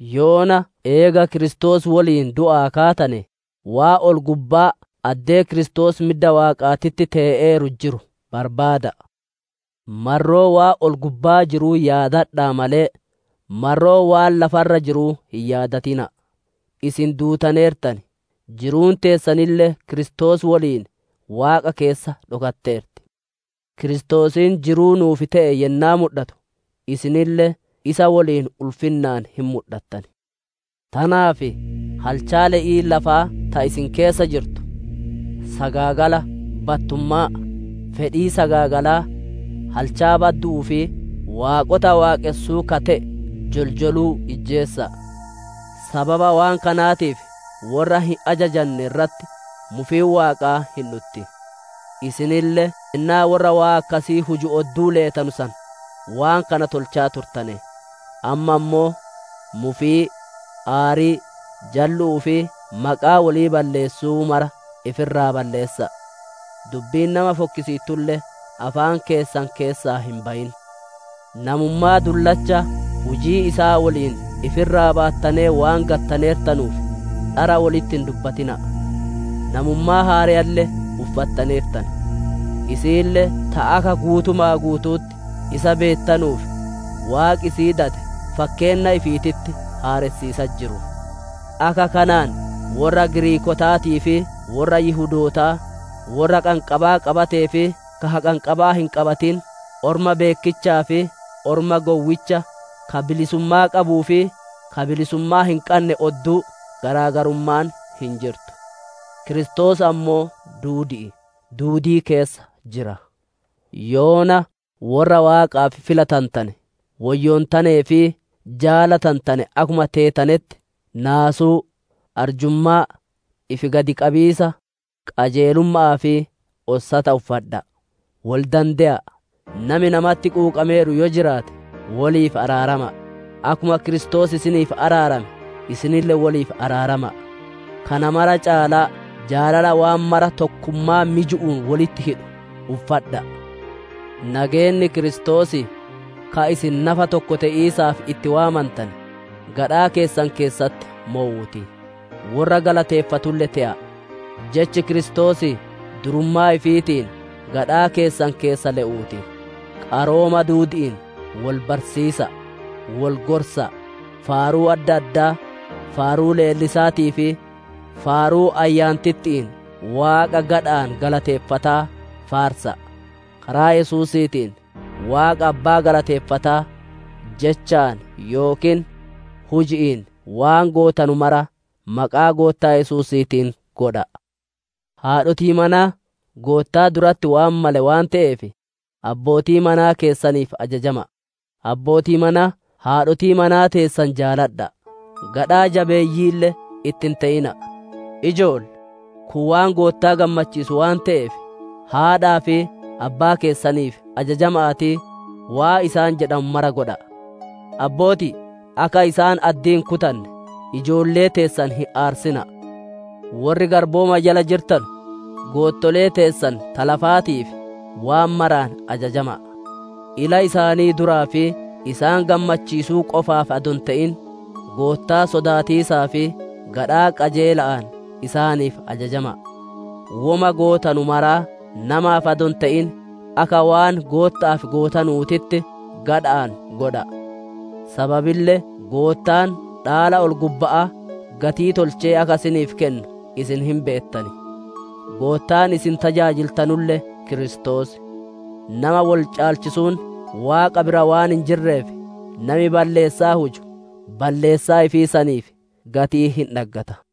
Yoona eega Kiristoos woliin du'aa kaatane, waan ol-gubbaa addee Kiristoos midda Waaqaatitti tee'eeru jiru barbaada'a! Marroo waan ol-gubbaa jiruu yaadadha'a malee, marroo waan lafa irra jiruu hin yaadatina'a. Isin duutaneertan; jiruun teessanille Kiristoos woliin Waaqa keessa dhokatteerti. Kiristoosiin jiruu nuuf te'e yennaa mudhatu, isinille isa woliin ulfinnaan hin mudhattan. Tanaaf halchaa le'ii lafaa ta isin keessa jirtu: sagaagala, battummaa, fedhii sagaagalaa, halchaa baddu'uu fi waaqota dharaa waaqonsuu ka te'e joljoluu ijjeesa'a. Sababa waan kanaatiif worra hin ajajanne irratti mufiin Waaqaa hin dhutti. Isinille yennaa worra waan akkasii huju odduu leetanu san waan kana tolchaa turtane. Amma ammoo; mufii, aarii, jallu'uu fi maqaa wolii balleessuu mara ifi irraa balleessa'a; dubbiin nama fokkisiittulle afaan keessan keessaa hin bayin. Namummaa dullacha hujii isaa woliin ifi irraa baattanee waan gattaneertanuuf, dhara wolitti hin dubbatina'a. Namummaa haareyalle uffattaneertan; isiille ta akka guutuma guutu'utti isa beettanuuf, Waaqi isii dade fakkeenna ifiititti haaressiisatti jiru. Akka kanaan worra Giriikootaatii fi worra Yihudootaa, worra haqanqabaa qabatee fi ka haqanqabaa hin qabatin, orma beekkichaa fi orma gowwicha, ka bilisummaa qabuu fi ka bilisummaa hin qanne odduu garaa garummaan hin jirtu; Kiristoos ammoo duudi'i, duudii keessa jira. Yoona worra Waaqaaf filatantane, woyyoontanee fi jaalatantane akkuma teetanetti naasuu, arjummaa, ifi gad qabiisa, qajeelumma'aa fi ossata uffadha'a. Wol dande'a; nami namatti quuqameeru yoo jiraate, woliif araarama'a; akkuma Kiristoos isiniif araarame, isinille woliif araarama'a. Kana mara caalaa jaalala waan mara tokkummaa miju'uun wolitti hidhu uffadha'a. Nageenni Kiristoosii, ka isin nafa tokko te'iisaaf itti waamantane, gadhaa keessan keessatti mowuu ti; worra galateeffatulle te'a. Jechi Kiristoosii durummaa ifiitiin gadhaa keessan keessa le'uu ti; qarooma duudi'iin wol barsiisa'a, wol gorsa'a; faaruu adda addaa, faaruu leellisaatii fi faaruu Ayyaantitti'iin Waaqa gadha'aan galateeffataa faarsa'a. Karaa Yesuusiitiin Waaqa Abbaa galateeffataa, jechaan yookiin huji'iin waan gootanu mara maqaa Goottaa Yesuusiitiin godha'a. Haadhotii manaa! Goottaa duratti waan male waan te'eef abbootii manaa keessaniif ajajama'a. Abbootii manaa! Haadhotii manaa teessan jaaladha'a; gadhaa jabeeyyiille itti hin te'ina'a. Ijoollee! Kun waan Goottaa gammachiisu waan te'eef, haadhaa fi abbaa keessaniif ajajama'aatii, waan isaan jedhanu mara godha'a. Abbootii! Akka isaan addii hin kutanne, ijoollee teessan hin aarsina'a. Worri garbooma jala jirtanu! Goottolee teessan ta lafaatiif waan maraan ajajama'a; ila isaanii duraa fi isaan gammachiisuu qofaaf adoo hin te'in, Goottaa sodaatiisaa fi gadhaa qajeela'aan isaaniif ajajama'a. Woma gootanu maraa namaaf adoo hin te'in, akka waan Gootta'aaf gootanuutitti, gadhaa tokkochaan godha'a. Sababille Goottaan dhaala ol-gubba'aa gatii tolchee akka isiniif kennu isin hin beettan; Goottaan isin tajaajiltanulle Kiristoos. Nama woli caalchisuun Waaqa bira waan hin jirreef, nami balleessaa huju, balleessaa ifii saniif gatii hin dhaggata.